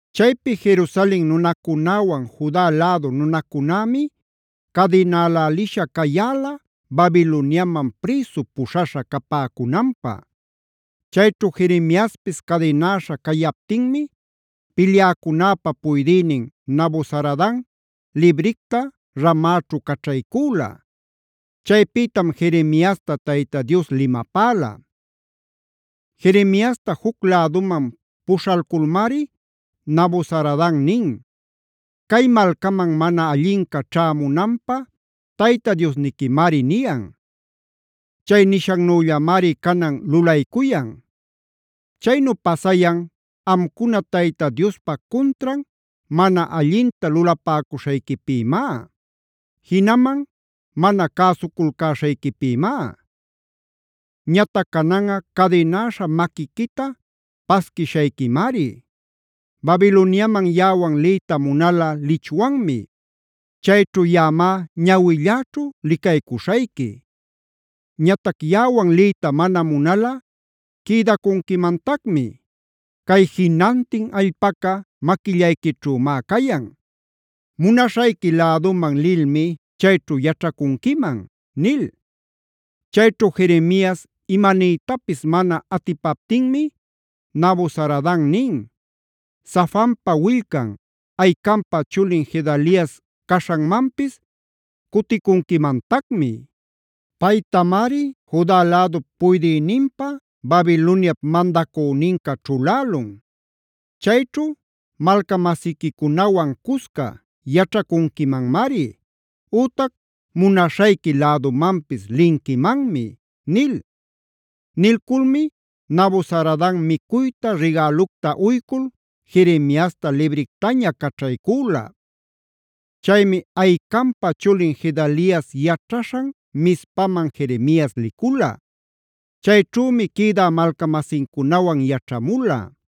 Chaypi Jerusalen nunacunäwan Juda lädu nunacunämi cadinälälisha cayäla Babiloniaman prïsu puśhaśha capäcunanpä. Chayćhu Jeremiaspis cadinäśha cayaptinmi pilyäcunäpa puydïnin Nabuzaradan libricta Ramaćhu caćhaycüla. Chaypïtam Jeremiasta Tayta Dios limapäla. Jeremiasta juc läduman puśhalculmari Nabuzaradan nin: “Cay malcaman mana allinca ćhämunanpä Tayta Diosniquimari niyan. Chay nishannüllamari canan lulaycuyan. Chaynu pasayan amcuna Tayta Diospa cuntran mana allinta lulapäcuśhayquipïmá; jinaman mana cäsuculcäśhayquipïmá. Ñatac cananꞌa cadinäśha maquiquita pasquishayquimari. Babiloniaman yaꞌawan liyta munalꞌa lichwanmi. Chayćhu yaꞌamá ñawilläćhu licaycuśhayqui. Ñatac yaꞌawan liyta mana munalꞌa quïdacunquimantacmi. Cay jinantin allpaca maquillayquićhümá cayan; munaśhayqui läduman lilmi chayćhu yaćhacunquiman” nil. Chayćhu Jeremias imaniytapis mana atipaptinmi Nabuzaradan nin: “Safanpa willcan, Ahicampa chulin Gedalias caśhanmanpis cuticunquimantacmi. Paytamari Juda lädup puydïninpä Babiloniap mandacüninca ćhulälun. Chayćhu malca-masiquicunawan cusca yaćhacunquimanmari, ütac munaśhayqui lädumanpis linquimanmi” nil. Nilculmi Nabuzaradan micuyta, rigälucta uycul Jeremiasta librictaña caćhaycüla. Chaymi Ahicampa chulin Gedalias yaćhaśhan Mizpaman Jeremias licula. Chayćhümi quïdä malca-masincunawan yaćhamula.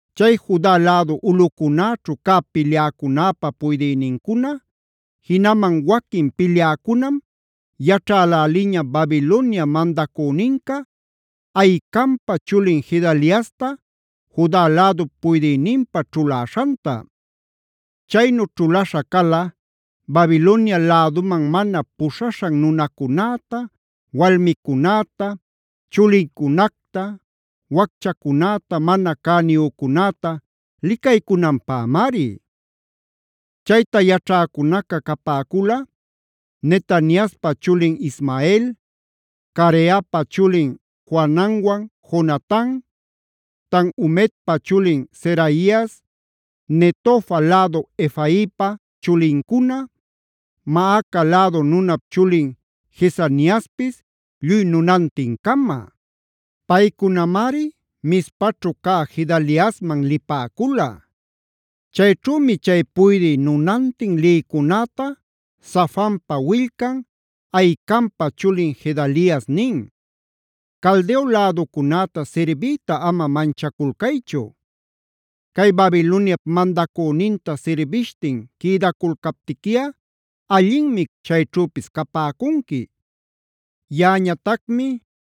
Chay Juda lädu ulꞌucunäćhu cä pilyäcunäpa puydïnincuna, jinaman waquin pilyäcunam yaćhäläliña Babilonia mandacüninca Ahicampa chulin Gedaliasta Juda lädup puydïninpä ćhuläśhanta. Chaynu ćhulaśha cala Babilonia läduman mana puśhaśhan nunacunäta, walmicunäta, chulincunacta, wacchacunäta, mana cäniyücunäta licaycunanpämari. Chayta yaćhäcunaca capäcula: Netaniaspa chulin Ismael, Careapa chulin Johananwan Jonatan, Tanhumetpa chulin Seraias, Netofa lädu Efaipa chulincuna, Maaca lädu nunap chulin Jezaniaspis lluy nunantin-cama. Paycunamari Mizpaćhu cä Gedaliasman lipäcula. “Chayćhümi chay puydï nunantin lïcunäta Safanpa willcan, Ahicampa chulin Gedalias nin: ‘Caldeo läducunäta sirbiyta ama manchaculcaychu. Cay Babiloniap mandacüninta sirbishtin quïdaculcaptiquiꞌa, allinmi chayćhüpis capäcunqui. Yaꞌañatacmi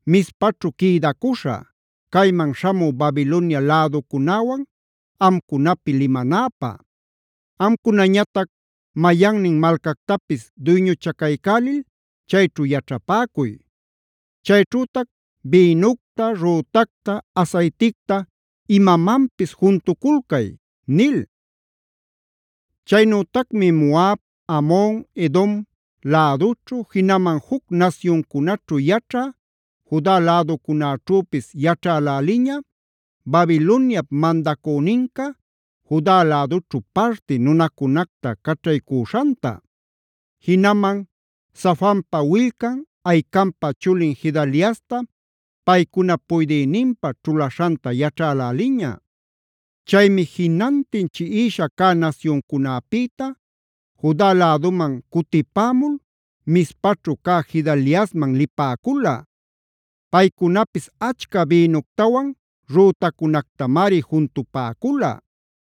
Mizpaćhu quïdacuśhä, cayman śhamü Babilonia läducunäwan amcunapi limanäpä. Amcunañatac mayannin malcactapis duyñuchacaycälil, chayćhu yaćhapäcuy. Chayćhütac bïnucta, rütacta, asayticta imamanpis juntuculcay’” nil. Chaynütacmi Moab, Amon, Edom lädućhu, jinaman juc nasyuncunaćhu yaćhä Juda läducunaćhüpis yaćhäläliña, Babiloniap mandacüninca Juda lädućhu parti nunacunacta caćhaycüśhanta. Jinaman Safanpa willcan, Ahicampa chulin Gedaliasta paycunap puydïninpä ćhuläśhanta yaćhäläliña. Chaymi jinantin chiꞌishaa cä nasyuncunäpïta Juda läduman cutipämul Mizpaćhu cä Gedaliasman lipäcula. Paycunapis achca bïnuctawan rütacunactamari juntupäcula.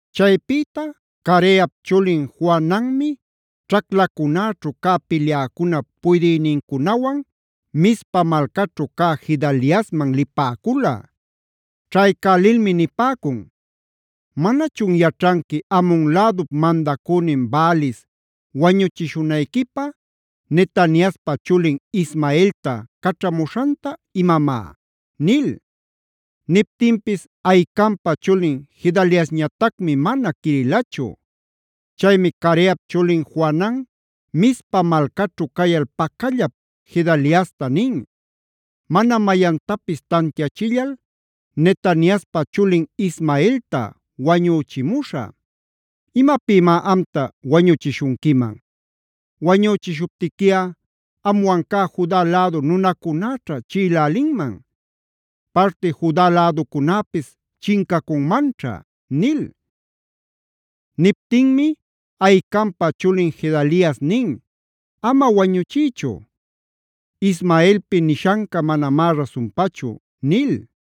Chaypïta Careap chulin Johananmi ćhaclacunäćhu cä pilyäcunap puydïnincunawan Mizpa malcaćhu cä Gedaliasman lipäcula. Ćhaycälilmi nipäcun: “¿Manachun yaćhanqui Amon lädup mandacünin Baalis wañuchishunayquipä Netaniaspa chulin Ismaelta caćhamuśhanta imamá?” nil. Niptinpis Ahicampa chulin Gedaliasñatacmi mana quirilachu. Chaymi Careap chulin Johanan Mizpa malcaćhu cayal pacallap Gedaliasta nin: “Mana mayantapis tantiachillal Netaniaspa chulin Ismaelta wañüchimuśhä. ¿Imapïmá amta wañüchishunquiman? Wañüchishuptiquiꞌa amwan cä Juda lädu nunacunäćha chiꞌilälinman; parti Juda läducunäpis chincacunmanćha” nil. Niptinmi Ahicampa chulin Gedalias nin: “Ama wañuchiychu. Ismaelpi nishanca manamá rasunpachu” nil.